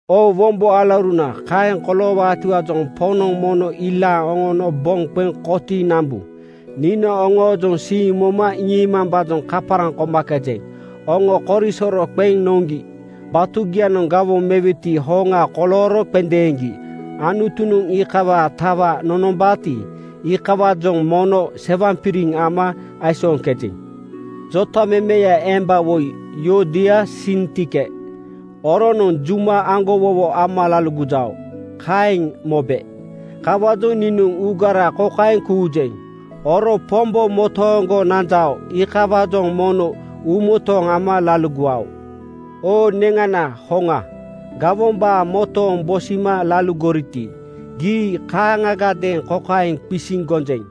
Oo wombo alauruna, kaeŋ koloowaatiwaajoŋ Poŋnoŋ mono ilaaŋ oŋono boŋ qeŋ kotiiŋ nambu. Niinoŋ oŋoojoŋ siiŋ moma iŋiimambaajoŋ kaparaŋ komakejeŋ. Oŋo korisoro qeŋ noŋgi. Batugianoŋ gawoŋ mewetiwaa hoŋa kolooro qendeeŋgi Anutunoŋ iikawaa tawa nonombaati, iikawaajoŋ mono sewaŋpiriŋ ama aisooŋkejeŋ. Jotamemeya emba woi Yuodia Sintike, oronoŋ juma aŋgowowo ama laligojao, kaeŋ mobe. Kawaajoŋ niinoŋ uugara kokaeŋ kuujeŋ: Oro Pombo motooŋgo nanjao, iikawaajoŋ mono uumotooŋ ama laligowao. Oo neŋana hoŋa, gawombaa motooŋ bosima laligoriti, gii kaaŋagadeeŋ kokaeŋ qisiŋ gonjeŋ: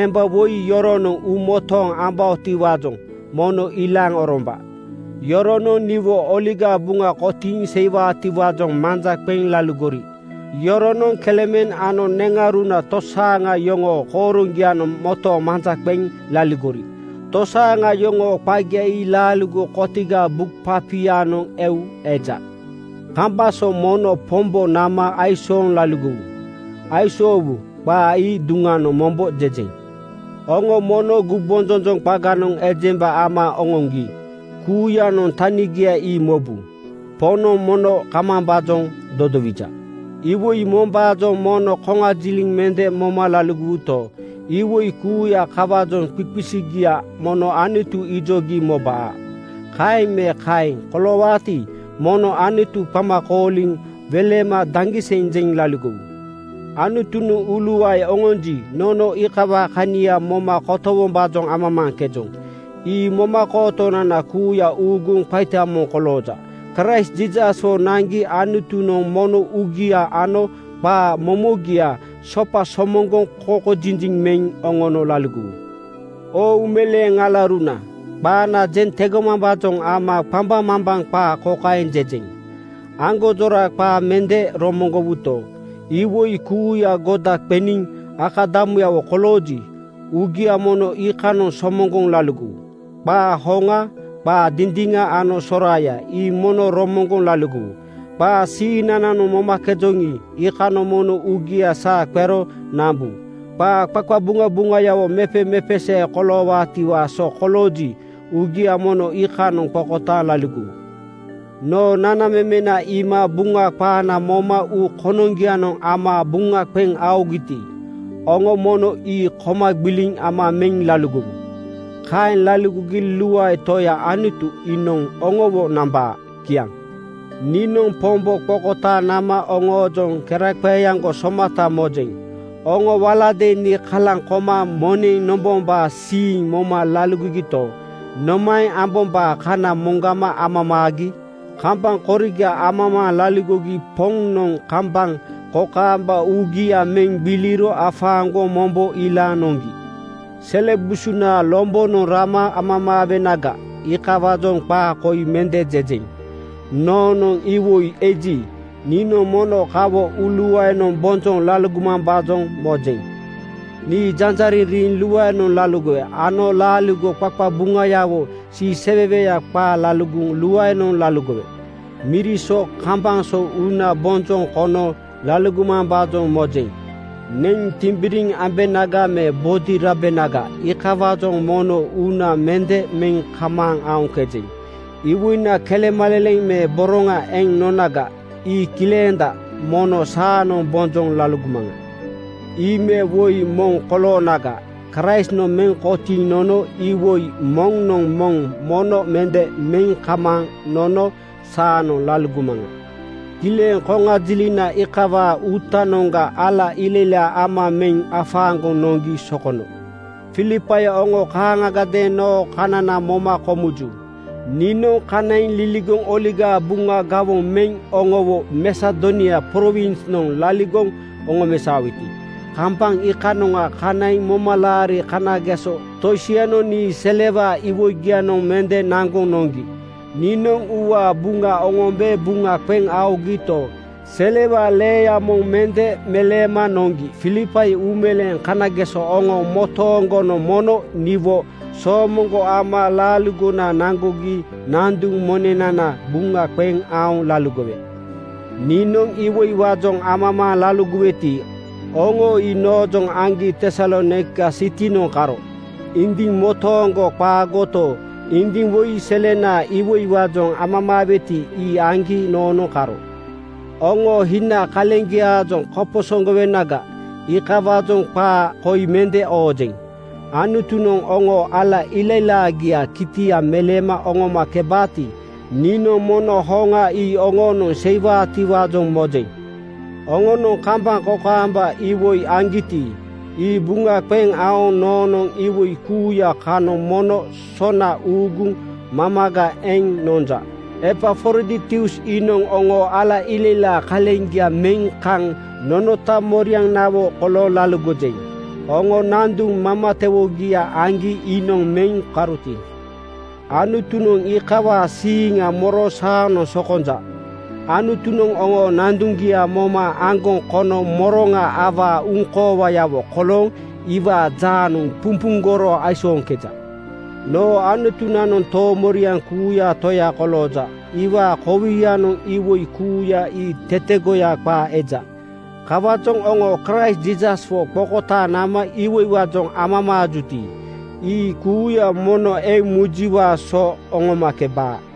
Emba woi yoronoŋ uumotooŋ ambaotiwaajoŋ mono ilaaŋ oromba. Yoronoŋ niwo Oligaa Buŋa kotiiŋ seiwaatiwaajoŋ manja qeŋ laligori. Yoronoŋ Kleemen ano neŋauruna tosaaŋa yoŋoo kooroŋgianoŋ motooŋ manja qeŋ laligori. Tosaaŋa yoŋoo qagia ii laaligo kotigaa buk papianoŋ eu eja. Kambaŋ so mono Pombo nama aisooŋ laligowu. Aisoowu qaa ii duŋanoŋ mombo jejeŋ. Oŋo mono gumbonjonjoŋ qaganoŋ ejemba ama oŋoŋgi kuuyanoŋ tanigia ii mobu. Poŋnoŋ mono kamambaajoŋ dodowija. Iwoi mombaajoŋ mono koŋajiliŋ mende moma laligowuto, iwoi kuuya kawaajoŋ qiqisigia mono Anutu ijogi mobaa. Kaeŋ me kaeŋ koloowaati, mono Anutu qama kooliŋ welema daŋgiseŋ jeŋ laligowu. Anutunoŋ uuluae oŋonji, nono iikawaa kania moma kotowombaajoŋ amamaaŋkejoŋ. Ii momakootonana kuuya uuguŋ qaita moŋ kolooja. Kraist Jiisaswo naŋgi Anutunoŋ mono uugia ano qaa momogia sopa somoŋgoŋ kokojiji meŋ oŋono laligowu. Oo uumeleeŋ alauruna, qaana jeŋ tegomambaajoŋ ama qambaŋmambaŋ qaa kokaeŋ jejeŋ: Aŋgonjora qaa mende romoŋgowuto, iwoi kuuya goda qeniŋ akadamuyawo kolooji, uugia mono iikanoŋ somoŋgoŋ laligowu. Qaa hoŋa, qaa dindiŋa ano soraaya ii mono romoŋgoŋ laligowu. Qaa siiŋnananoŋ momakejoŋi, iikanoŋ mono uugia saa qero nambu. Qaa qaqabuŋabuŋayawo mepemepesee koloowaatiwaa so kolooji, uugia mono iikanoŋ qokotaaŋ laligowu. Noo nanamemena iima Buŋa qaana moma uu konoŋgianoŋ ama buŋa qeŋ aogiti, oŋo mono ii koma gbiliŋ ama meŋ laligowu. Kaeŋ laligogi luae Toya Anutu iinoŋ oŋowo nambaa. Kiaŋ. Niinoŋ Pombo qokotaaŋ nama oŋoojoŋ keraqeeaŋgo somata mojeŋ. Oŋo waladeeŋ nii kalaŋ koma moneŋ nombombaa siiŋ moma laligogito, nomaeŋ ambombaa kana moŋgama amamaagi. Kambaŋ koriga amamaaŋ laligogi Poŋnoŋ kambaŋ kokaamba uugia meŋ gbiliro afaaŋgoŋ mombo ilaaŋ noŋgi. Sele busunaa lombonoŋ rama amamaawenaga, iikawaajoŋ qaa koi mende jejeŋ. Noonoŋ iwoi eji, niinoŋ mono kawo uuluaenoŋ bonjoŋ laligomambaajoŋ mojeŋ. Nii janjariŋ riiŋ luaenoŋ laligowe ano laaligo qaqabuŋayawo siiseweweya qaa laligoŋ luaenoŋ laligowe. Miri so kambaŋ so uuna bonjoŋ kono laligomambaajoŋ mojeŋ. Neŋ timbiriŋ ambenaga me bodi rabenaga, iikawaajoŋ mono uuna mende meŋ kamaaŋ aoŋkejeŋ. Iwoina kelemaleleŋ me boroŋa eŋ nonaga, ii kilenda. Mono saanoŋ bonjoŋ laligomaŋa. Ii me woi moŋ koloonaga, Kraistnoŋ meŋ kotiiŋ nono iwoi moŋnoŋ moŋ mono mende meŋ kamaaŋ nono saanoŋ laligomaŋa. Kileŋ koŋajilina iikawaa uutanoŋga ala ilailaa ama meŋ afaaŋgoŋ noŋgi sokono. Filipai oŋo kaaŋagadeeŋ noo kanana moma komuju. Niinoŋ kanaiŋ liligoŋ Oligaa Buŋa gawoŋ meŋ oŋowo Masedonia prowinsnoŋ laligoŋ oŋomesaoweti, kambaŋ iikanoŋa kanaiŋ momalaari kanageso tosianoŋ nii selewaa iwoigianoŋ mende naŋgoŋ noŋgi. Niinoŋ uuwaa Buŋa oŋombe buŋa qeŋ aogito, selewaa leeya moŋ mende meleema noŋgi. Filipai uumeleeŋ kanageso oŋo motooŋgonoŋ mono niwo soomoŋgo ama laaligona naŋgogi nanduŋ monenana buŋa qeŋ aoŋ laligowe. Niinoŋ iwoiwaajoŋ amamaaŋ laligoweti, oŋo ii noojoŋ aŋgi Tesalonaika sitinoŋ karo. Indiŋ motooŋgo qaagoto, indiŋ woi selenaa iwoiwaajoŋ amamaaweti, ii aŋgi noonoŋ karo. Oŋoo hina kaleŋgiaajoŋ koposoŋgowenaga, iikawaajoŋ qaa koi mende oojeŋ. Anutunoŋ oŋoo ala ilailaagiaa kitia meleema oŋomakebaati, niinoŋ mono hoŋa ii oŋoonoŋ seiwaatiwaajoŋ mojeŋ. Oŋonoŋ kambaŋ kokaamba iwoi aŋgiti, ii buŋa qeŋ aoŋ noonoŋ iwoi kuuya kanoŋ mono sona uuguŋ mamaga eŋ nonja. Epafroditus iinoŋ oŋoo ala ilailaa kaleŋgia meŋ kaŋ nonota morianawo kolooŋ laligojeŋ. Oŋo nanduŋ mamatewoogia aŋgi iinoŋ meŋ karoti, Anutunoŋ iikawaa siiŋa moro saanoŋ sokonja. Anutunoŋ oŋoo nanduŋgia moma aŋgoŋ kono moroŋa awaa uŋkoowayawo kolooŋ iwaa jaanoŋ pumpuŋgoro aisooŋkeja. Noo Anutunanoŋ toomoriaŋ kuuyaa Toya kolooja. Iwaa kowianoŋ iwoi kuuya ii tetegoya qaa eja. Kawaajoŋ oŋo Kraist Jiisaswo qokotaaŋ nama iwoiwaajoŋ amamaajuti, ii kuuya mono eŋ mujiwaa so oŋomakebaa.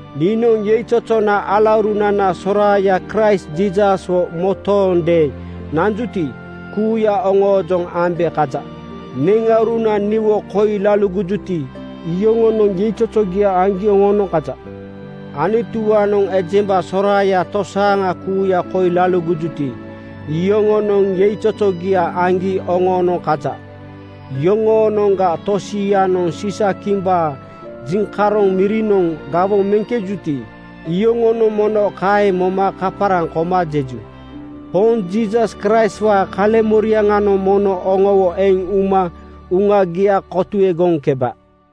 Niinoŋ yeizozona alaurunana soraaya Kraist Jiisaswo motoondeeŋ nanjuti, kuuya oŋoojoŋ ambe kaja. Neŋauruna niwo koi laligojuti, iyoŋonoŋ yeizozogia aŋgi oŋoonoŋ kaja. Anutuwaanoŋ ejemba soraaya tosaaŋa kuuya koi laligojuti, iyoŋonoŋ yeizozogia aŋgi oŋoonoŋ kaja. Yoŋoonoŋga tosianoŋ Siisakimbaa jiŋkaroŋ mirinoŋ gawoŋ meŋkejuti, iyoŋonoŋ mono kaeŋ moma kaparaŋ koma jeju. Poŋ Jiisas Kraistwaa kaleŋmoriaŋanoŋ mono oŋowo eŋ uma uŋagia kotuegoŋkeba.